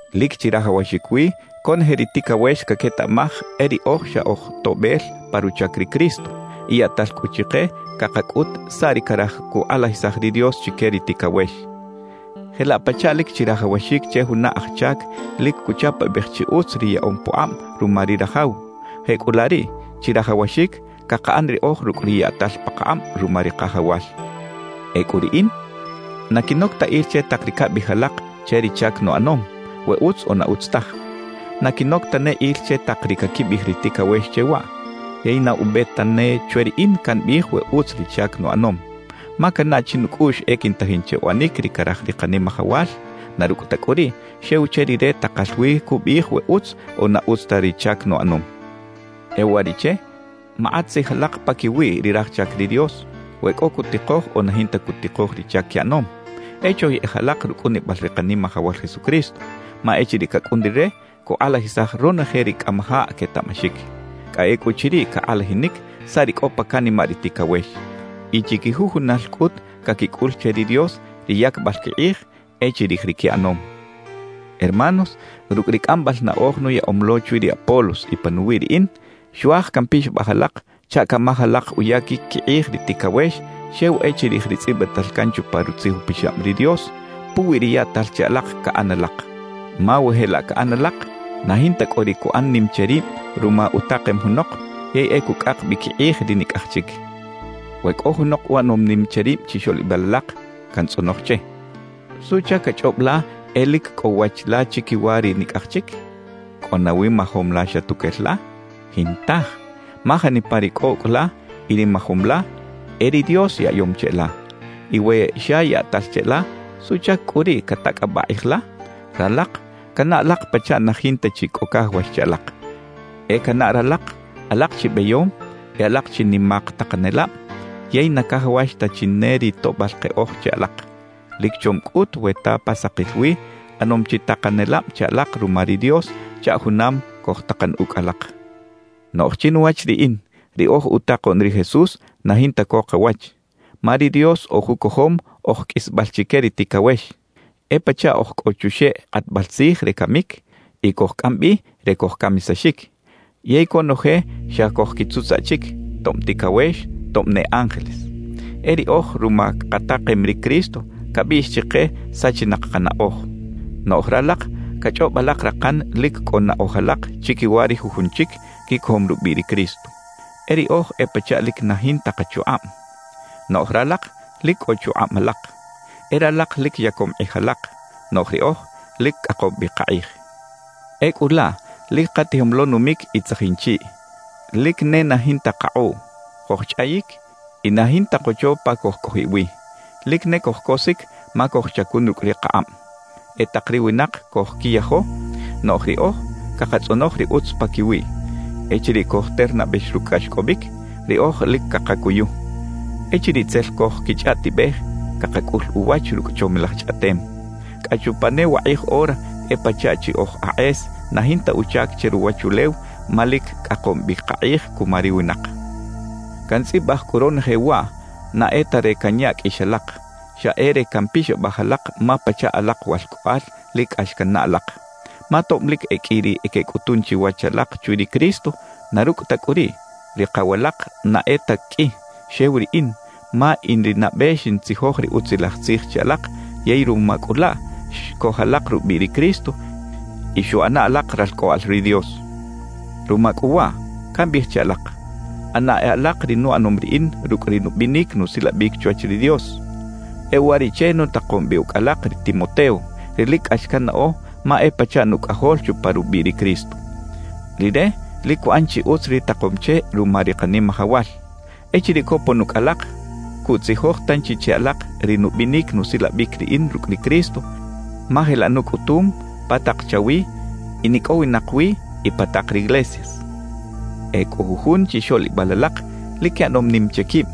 Lic chirajawaxic wi conoje ri ticawex caquetaꞌmaj e riꞌoj xa oj toꞌbel pa ruchac ri Cristo, y yaꞌtal cꞌu chike cakacꞌut saꞌ ri caraj cukꞌalajisaj ri Dios chique ri ticawex. Jelaꞌ pachaꞌ lic chirajawaxic che juna aj chac lic cuchapabej chi utz ri yaꞌom pukꞌab ruma ri rajaw; jecꞌulaꞌ riꞌ chirajawaxic cakaꞌan riꞌoj rucꞌ ri yaꞌtal pakakꞌab ruma ri Kajawal. Ecꞌu riꞌin na quinoc ta il che tak ri cabiꞌij alak che ri chac nuꞌanom, we utz o na utz taj. Na quinoc tane il che tak ri caquibiꞌij ri ticawex che waꞌ. Yey na ube tane chwe riꞌin cambiꞌij we utz ri chac nuꞌanom. Ma cannaꞌ chinucꞌuꞌx e quintajin che uꞌanic ri caraj ri Kanimajawal; na rucꞌ ta cꞌu riꞌ, xew che Rire takal wi cubiꞌij we utz o na utz ta ri chac nuꞌanom. E uwariꞌche makꞌat tzij alak paquiwi ri raj chac ri Dios, we cꞌo cutikoj o na jinta cutikoj ri chac quiꞌanom; e choyeꞌej alak rucꞌunibal ri Kanimajawal Jesucristo, ma echiriꞌ cacꞌun Rire, cukꞌalajisaj ronoje ri cꞌamajaꞌ quetaꞌmaxic. Cꞌa ecꞌuchiriꞌ cakꞌalajinic saꞌ ri cꞌo pa canimaꞌ ri ticawex. Y chiquijujunal cꞌut caquicꞌul che ri Dios ri yacbal quikꞌij e chirij ri quiꞌanom. Hermanos, rucꞌ ri cꞌambal naꞌoj nuyaꞌom lo chwi ri Apolos y panuwi riꞌin, xuaj campixabaj alak chaꞌ camaj alak uyaquic quikꞌij ri ticawex xew e chirij ri tzꞌibital can chupa Rutzij Upixab ri Dios puwi ri yaꞌtal che alak caꞌan alak. Ma we jelaꞌ caꞌan alak, na jinta cꞌo ri cuꞌan nim che rib ruma utakem junok yey e cucꞌak bi quikꞌij ri nicꞌaj chic. We cꞌo junok uꞌanom nim che rib chixoꞌlibal alak, cantzꞌonoj che: «¿Suꞌchac cachꞌob la e lic cꞌo wach la chiquiwa ri nicꞌaj chic? ¿Cꞌo nawi majom la xa tuquel la? Jintaj, ma janipa ri cꞌo ucꞌ la y ri majom la, e ri Dios yaꞌyom cheꞌla. Y we xa yaꞌtal cheꞌla, ¿suꞌchac cꞌu riꞌ catacꞌabaꞌ kꞌij la?» Ralak canaꞌ alak pachaꞌ na jinta chi cꞌo cajawax che alak. E canaꞌ ralak alak chi beyom y alak chi nimak takanelab; yey na cajawax ta chi ne ri toꞌbal keꞌoj che alak. Lic chom cꞌut we ta pa sakil wi ꞌanom chi takanelab che alak ruma ri Dios chaꞌ junam cojtakan ucꞌ alak. Noꞌj chinuwach riꞌin, ri oj utakoꞌn ri Jesús na jinta co kawach. Ma ri Dios oj ucojom oj qꞌuisbal chique ri ticawex. E pachaꞌ oj cꞌo chuxeꞌ kꞌatbal tzij re camic y cojcꞌam bi re cojcamisaxic, yey conoje xa cojquitzutzaꞌ chic, tob ticawex, tob ne ángeles. E riꞌoj ruma katakem ri Cristo cabiꞌx chike sachinak kanaꞌoj; noꞌj ralak cachꞌob alak rakan lic cꞌo naꞌoj alak chiquiwa ri jujun chic quicojom rubiꞌ ri Cristo. E riꞌoj e pachaꞌ lic na jinta kachukꞌab, noꞌj ralak lic cꞌo chukꞌab alak. E ralak lic yacom kꞌij alak, noꞌj riꞌoj lic cꞌakom bi kakꞌij. Ecꞌu laꞌ lic katijom lo numic y tzajin chiꞌ, lic ne na jinta kakꞌuꞌ. Cojchꞌayic y na jinta kocho pa cojcꞌojiꞌ wi. Lic ne cojcosic ma cojchacun rucꞌ ri kakꞌab. E tak ri winak cojquiyajo, noꞌj riꞌoj cakatzꞌonoj ri utz paquiwiꞌ. Echiriꞌ cojternabex rucꞌ cꞌaxcꞌobic, riꞌoj lic cakacuyu. Echiriꞌ tzel cojquichꞌaꞌtibej, cakacꞌul uwach rucꞌ chomilaj chꞌaꞌtem. Cꞌa chupa ne wakꞌij ora e pachaꞌ chi oj akꞌes na jinta uchac che ruwachulew ma lic cꞌakom bi kakꞌij cuma ri winak. Cantzꞌibaj cꞌu ronoje waꞌ na e ta re canya qꞌuix alak; xa e re campixabaj alak ma pachaꞌ alak walcꞌoꞌal lic cꞌax cannaꞌ alak. Ma tob lic e qꞌui ri quecꞌutun chiwach alak chwi ri Cristo, na rucꞌ ta cꞌu riꞌ, ri kaw alak na e ta qꞌui, xew riꞌin, ma in ri nabe xintzijoj ri Utzilaj Tzij che alak yey ruma cꞌu laꞌ, xcoj alak rubiꞌ ri Cristo y xuꞌana alak ralcꞌoꞌal ri Dios. Ruma cꞌu waꞌ, cambiꞌij che alak: ꞌAna e alak ri nuꞌanom riꞌin rucꞌ ri nubinic nusilabic chwach ri Dios. E uwariꞌche nutakom bi ucꞌ alak ri Timoteo, ri lic cꞌax cannaꞌo ma e pachaꞌ nucꞌajol chupa rubiꞌ ri Cristo. Rire lic cuꞌan chi utz ri takom che ruma ri Kanimajawal. Echiriꞌ copon ucꞌ alak, cuꞌtzijoj tanchi che alak ri nubinic nusilabic riꞌin rucꞌ ri Cristo, ma jelaꞌ nucꞌutum pa tak chawi in icꞌowinak wi y pa tak riglesias. E cꞌo jujun chixoꞌlibal alak lic quiꞌanom nim che quib,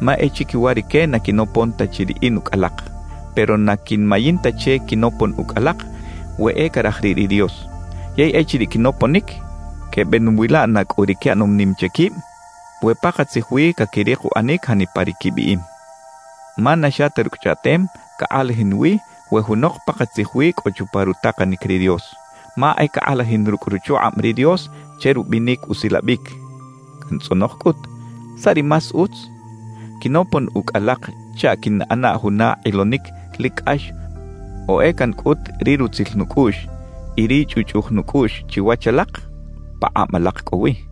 ma e chiquiwa rique na quinopon ta chi riꞌin ucꞌ alak. Pero na quinmayin ta che quinopon ucꞌ alak we e caraj riꞌ ri Dios. Yey echiriꞌ quinoponic, quebeꞌnuwila na cꞌu ri quiꞌanom nim che quib, we pakatzij wi caquirik uꞌanic janipa ri quibiꞌim. Ma na xa ta rucꞌ chꞌaꞌtem cakꞌalajin wi we junok pakatzij wi cꞌo chupa rutakanic ri Dios, ma e cakꞌalajin rucꞌ ruchukꞌab ri Dios che rubinic usilabic. Cantzꞌonoj cꞌut: ¿Saꞌ ri más utz? ¿Quinopon ucꞌ alak chaꞌ quiꞌnꞌana juna kꞌilonic lic cꞌax o e cancꞌut ri rutzil nucꞌuꞌx y ri chꞌuꞌchꞌuj nucꞌuꞌx chiwach alak? Pakꞌab alak cꞌo wi.